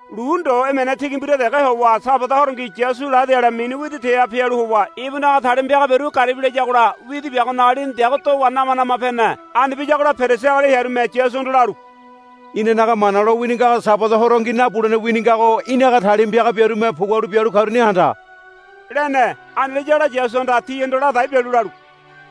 Lu ndo emene tigi mbira dege howa Sabada horongi Yasu ladi ale mini widi teha pialu howa ibunaga talima piaga biaru garibi layagola widi biagonaga lini deago dowa nama nama pene. Ani biyagola Perisi agali hearume Yasuhondo lalu, Inanaga Mana lowini ngago Sabada horongi nabulene wini ngago í̠naga talima piaga biarume pugualu bialu karuni handa, lene. Ani layagola Yasuhanda tihondo ladai bialu lalu,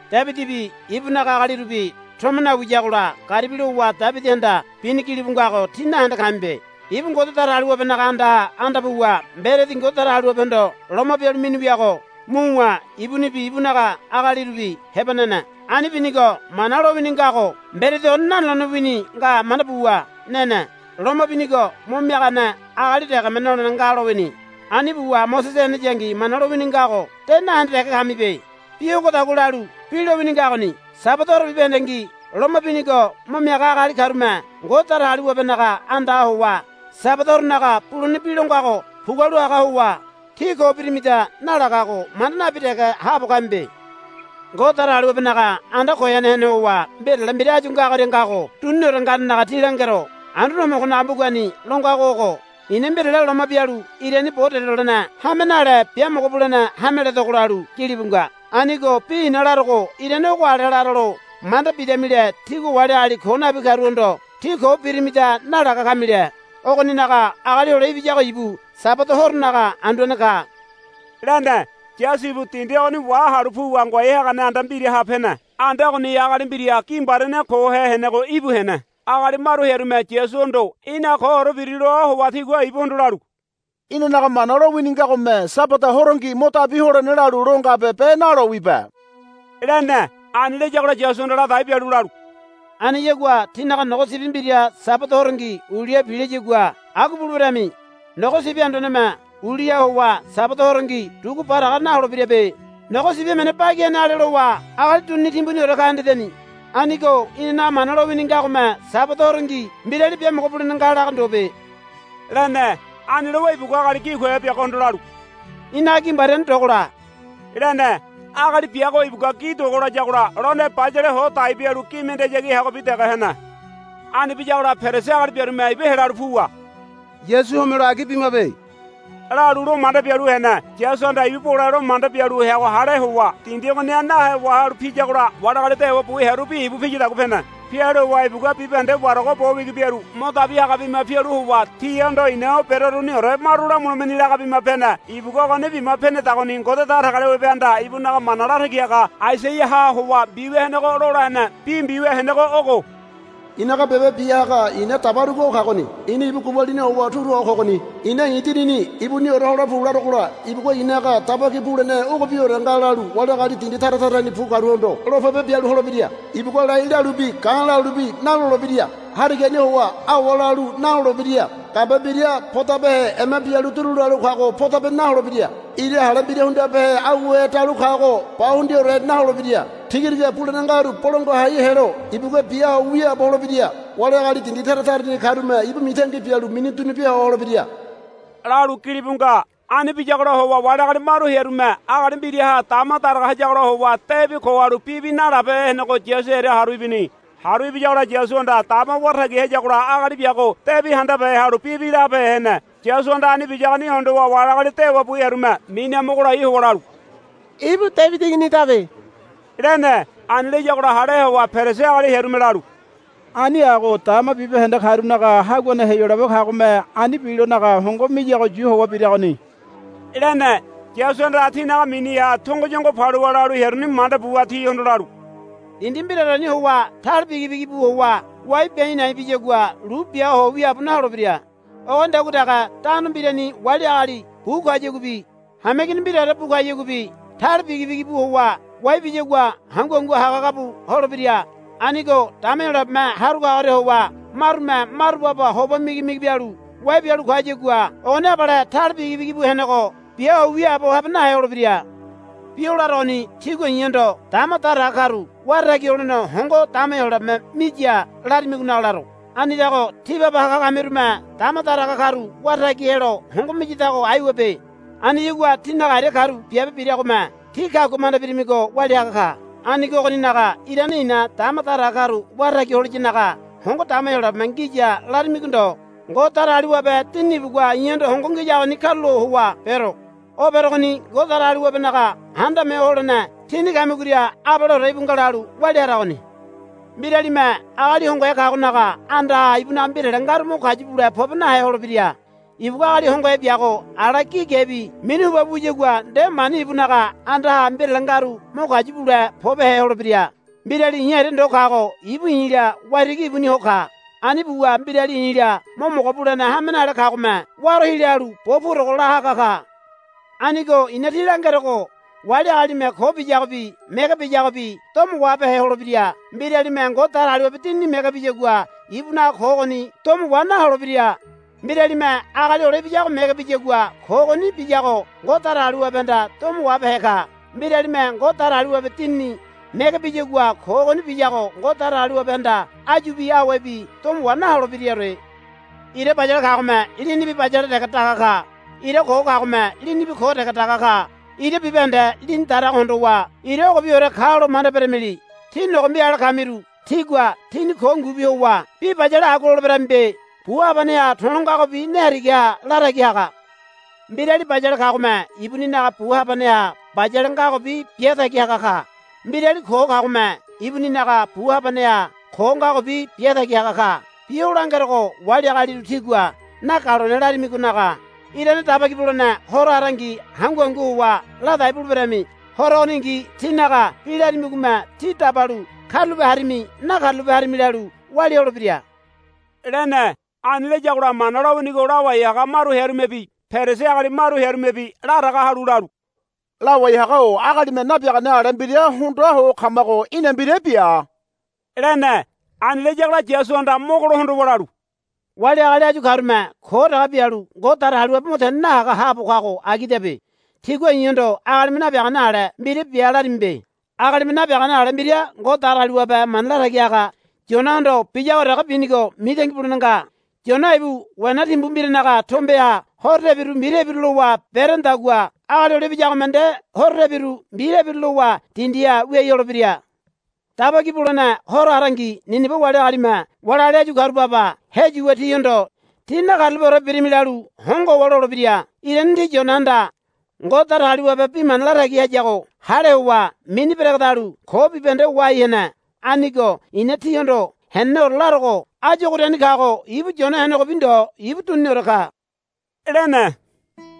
Debidibi ibunaga agalirubi tomo nawiyagola garibi lowa Debidihanda bini gilibu ngago tí nahende kamibe. Ibu Ngode Datagaliwabenaga andaha anda puwa mberedi Ngode Datagaliwabehondo loma bialu mini wiago muwa ibunibi ibunaga agalirubi heba nene. Ani binigo Mana lowini ngago mberedi ogoni nanolene wini nga manda buwa nene. Loma binigo mo miagane agali degeme nolene nga lowini. Ani buwa Mosese heneyangi Mana lowini ngago de nahende dege kamibe. Bi ogodagua lalu bi lowini ngagoni. Sabada horo bibahendengi loma binigo mo miaga agali karume Ngode Datagaliwabenaga andaha howa Sabada horonaga bulene bi lo ngago pugualu haga howa, Tí ko birimida, nalagago manda nabi dege haabo kamibe. Ngode Datagaliwabenaga anda goyane hene howa mbirale mbira áyu ogoria ngago duniniore nganenaga tí langero. Anduane Homogonaga mbugani lo ngago ogo, I̱na mbirale loma bialu irani bo delolene hame nale biamogo bulene hame ledogo, lalu gilibu nga. Anigo bi i̱na larogo irane ogo ale laralo manda bidamile tígua wali agali ko nabi karuhondo, Tí ko birimida, nalaga kamile. Ogoninaga Agali Hole Ibiyago ibu Sabada horonaga Anduane ka, lene. Yasu ibu dindi ogoni wahalu puwa ngoai hagane anda mbiraha pene. Anda ogoniha agali mbira gi mbariane kohe henego íbu hene. Agali maru hearume Yasuhondo, Í̠na koore biri, loa howa tigua ibuhondo lalu, Inanaga Mana lowini ngagome Sabada horongi mo dabi holene lalu lo ngabe be nalowibe, lene. Ani layagola Yasuhanda ladai bialu lalu, Aniyagua tínaga nogo sibi mbira Sabada horongi uliha pilayagua agua buleberami. Nogo sibi anduaneme uliha howa Sabada horongi dugu baraga naholebirabe. Nogo sibi emene bagi hene ale lowa agali dunini timbuniore ka hendedeni. Anigo inanaga Mana lowini ngagome Sabada horongi mbirali biamogo bulene nga laga ndobe, lene. Ani lowa ibugua agali gi kohe biagohondo lalu, Í̠naga gi mbariane dogola, lene. Agali biago ibugua gi dogo layagola lone bayale ho dai bialu gi mendeyagi heagobi dege hene. Ani biyagola Perisi agali biarume ibu helalu puwa, Yasu homelo agi bimabe, lalu lo manda bialu hene. Yasuhanda ibu bole lo manda bialu heago hale howa dindi ogoniha nahe wahalu piyagola wali agali dewa bu hearubi ibu piyadagua pene. Pialu howa ibugua bibahende warago bo wigi biaru mo dabi haga bima pialu howa tihondo, I̱na o beroruniore maru lamulemeni, laga bima pene. Ibugua ogoni bima penedagoni Ngode Datagaliwabehanda ibunaga mana latagi haga Aisaiaha howa mbiwia henego lola hene. Bi mbiwia henego ogo, I̱naga biabe bia haga i̱na dabarugo o kagoni. I̱na ibu gubalini howa turu ho kogoni. I̱na i̱ Dinini ibuniore hole pu larogola ibugua i̱naga daba ki bulene ogobiore nga lalu wali agali dindi tara tarani bu karuhondo lo pebe bialu holebira. Ibugua lai lalubi ga̱ lalubi nalolebira. Harigani howa awa lalu nalolebira. Gambe mbira podabehe ema bialu duru lalu kago podope naholebira. Ira hale mbira hundibehe auhe dalu kago ba hundiaore naholebira. Tigatiga bulene ngaru bolangua hai helo ibugua bia ho wiaabo holebira. Wali agali dindi tara tarani karume ibu mitangi bialu mini dunu bia ho holebira, lalu gilibu nga. Ani biyagola howa wali agali maru hearume agali mbiraha dama daraga hayagola howa debi ko halu bibi nalabehe henego Yasu hearia haru ibini. Haru ibiyagola Yasuhanda dama wara tagi hayagola agali biago debi handabehe halu bibi labehe hene. Yasuhanda ani biyagoni hondowa wali agali dewa bu hearume miniha mogo lai howa lalu, Ibu Debidi Iginidabe, lene. Ani layagola hale howa Perisi agali hearume lalu, Ani ago dama bibahende karunaga haguane Heyolabe kagome ani bilonaga hongo miyago yu howa biragoni, lene. Yasuhanda tinaga miniha tongoyongo paluwa lalu hearuni manda buwa tihondo lalu, Dindi mbiraoreni howa tale bigi bigi bu howa wai bia a̱i̱ na̱i̱ biyagua lu bia ho wiaabo naholebira. Ogonidagua dege tano mbirani wali agali bu kayaguabi hameigini mbiraore bu kayaguabi tale bigi bigi bu howa wai biyagua hangu hangu haga haga bu holebira. Anigo dama Heyolabeme haru kagoria howa marume maru baba hoba migi migi bialu wai bialu kayagua ogoni abale tale bigi bigi bu henego bia ho wiaabo habe nahe holebira. Bi o larogoni tígua i̱hondo dama daraga karu wara tagi holene hongo dama Heyolabeme miya larimigonaga laro. Anidago tí baba haga kamirume dama daraga karu wara tagi helo hongo miyadago aiwabe. Aniyagua tínaga aria karu biabe biragome tí kagua manda birimigo walia haga ka. Anigo ogoninaga irane i̱na dama daraga karu wara tagi holiyanaga hongo dama Heyolabeme ngiya larimigo ndo. Ngode Datagaliwabe Dinini ibugua i̱hondo hongo ngiyagoni karulo howa bero. O berogoni Ngode Datagaliwabenaga Handame Ho Holene tíni kamigoria abaleore íbu nga lalu walia haragoni. Mbiralime agali hongohe kagonaga andaha ibunaga mbirale ngaru mo kayu bule pobe nahe holebira. Ibugua agali hongohe biago ala gi gebi minu huba bu wiyagua nde mani ibunaga andaha mbirale ngaru mo kayu bule pobehe holebira. Mbirali i̱ aria ndo kago ibu i̱la waitigi ibuni ho ka. Ani buwa mbirali i̱la mo mogo bulene hame nale kagome waro hila halu bo purogo la haga ka. Anigo i̱na tí langerogo wali agalime ko biyagobi mege biyagobi domo wahabehe holebira. Mbiralime Ngode Datagaliwabe Dinini mege biyagua ibunaga ko ogoni domo wa naholebira. Mbiralime Agali Hole Ibiyago mege biyagua ko ogoni biyago Ngode Datagaliwabehanda domo wahabehe ka. Mbiralime Ngode Datagaliwabe Dinini mege biyagua ko ogoni biyago Ngode Datagaliwabehanda áyubi awebi domo wa naholebiraore. Ira bayale kagome linibi bayale dege daga ka. Ira ko kagome linibi ko dege daga ka. Ira bibahende lini darago hondowa ira ogobiore kalo manda beramili. Tí nogombi ale kamiru. Tígua tíni ko ngubi howa bi bayale agua loleberamibe. Bu habaneha to̱lo ngagobi ne harigaha la tagi haga. Mbirali bayale kagome ibuninaga bu habaneha bayale ngagobi bia tagi haga ka. Mbirali ko kagome ibuninaga bu habaneha ko ngagobi bia tagi haga ka. Bi o langerogo wali agaliru tígua nagalone larimigonaga irane Daba Ki Bulene Horo harangi hangu hangu howa ladai buleberami. Horo ogoningi tínaga bi larimigome tí dabalu karulape harimi nakarulape harimi lalu walia holebira, lene. Ani layagola Mana lowinigo lawai haga maru hearumebi Perisi agali maru hearumebi laraga halu lalu, Lawai haga-o agalime nabiagane ale mbira hondoa ho kamago í̠na mbira bia, lene. Ani layagola Yasuhanda mogo lo hondowa lalu, Wali agali áyu karume ko dege bialu Ngode Datagaliwabe mo tene nahaga haabo kago agidabe. Tígua i̱hondo agalime nabiagane ale mbira bia larimibe. Agalime nabiagane ale mbira Ngode Datagaliwabe mana latagi haga Yonahondo biyago dege binigo mitangi bulene nga. Yona ibu wena timbu mbiranaga tombeha horo tebiru mbi tebiru lowa berenedagua Agali Hole Ibiyagome nde horo tebiru mbi tebiru lowa dindiha wiai holebira. Daba Ki Bulene Horo harangi Nineba wali agalime wali agali áyu karu baba heyuwa tihondo. Tí nakarulapeore birimi, lalu hongo howa lolebira. Irane ti Yonahanda Ngode Datagaliwabe bi mana latagi hayago hale howa mini beregedalu ko bibahende wahai hene. Anigo i̱na tíhondo heneneore larogo áyu ogoriani kago ibu Yona henegobi ndo ibu duniniore ka, lene.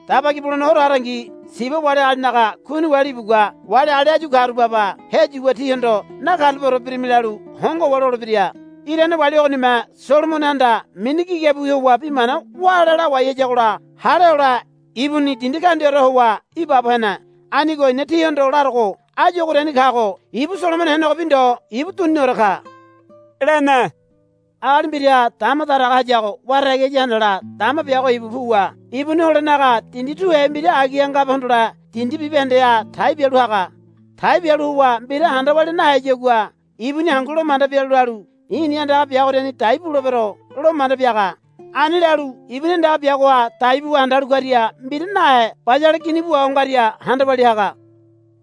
Daba Ki Bulene Horo harangi Siba wali agalinaga Kuini wali ibugua wali agali áyu karu baba heyuwa tihondo, Nakarulapeore birimi, lalu hongo howa lolebira. Irane wali ogonime Solomonohanda mini gigabiwi howa bi mana wále lawai hayagola hale hole ibuni dindi kaundiaore howa ibaabo hene. Anigo i̱na tíhondo larogo áyu ogoriani kago ibu Solomono henegobi ndo ibu duniniore ka, lene. Agali mbiraha dama daraga hayago wara tagi haya handala dama biago ibu puwa ibuni holenaga dindi tuhe mbira agiha ngabe hondole dindi bibahendeha tai bialu haga. Tai bialu howa mbira handa walia naheyagua ibuni hangu lo manda bialu lalu, I̱ni andaga biagoriani dai bulebero, lo manda biaga. Ani lalu ibuni andaga biagoha dai buwa handalu karia mbira nahe bayale gini bu waho ngaria handa walia haga.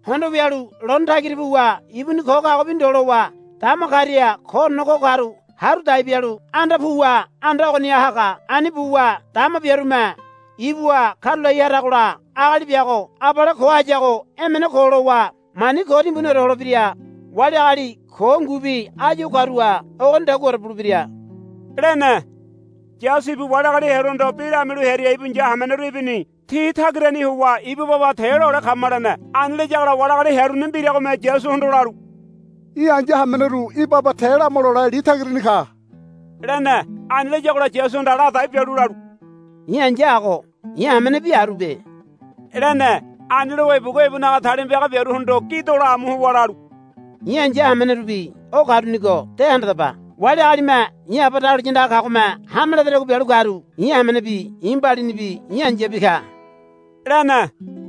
Hondo wialu lone tagira puwa ibuni ko kagobi ndo lowa dama karia koorene ko karu haru dai bialu anda puwa anda ogoniha haga. Ani buwa dama biarume ibuha karulai haragola agali biago abale ko hayago emene ko lowa mani ko timbuniore holebira. Wali agali ko ngubi áyu o karuha ogonidaguaore bulebira, lene. Yasu ibu wali agali hearuhondo bi lamialu hearia ibu ai̱ya hameneru ibini. Ti tagirani howa, Ibu baba te lole kama, lene. Ani layagola wali agali hearuni mbiragome Yasuhondo lalu, Í̠ ai̱ya hameneru í̠ baba te lama lole li tagirani ka, lene. Ani layagola Yasuhanda ladai bialu lalu, I̱ ai̱ya ago i̱ hamenebi arube, lene. Ani lowa ibugua ibunaga talima piaga biaruhondo gi dola amu howa lalu, I̱ ai̱ya hamenerubi o karunigo de handadaba. Wali agalime i̱ Aba dahuliya andaga kagome hame ledadagua bialu karu i̱ hamenebi i̱ mbalinibi i̱ ai̱yabi ka, lene.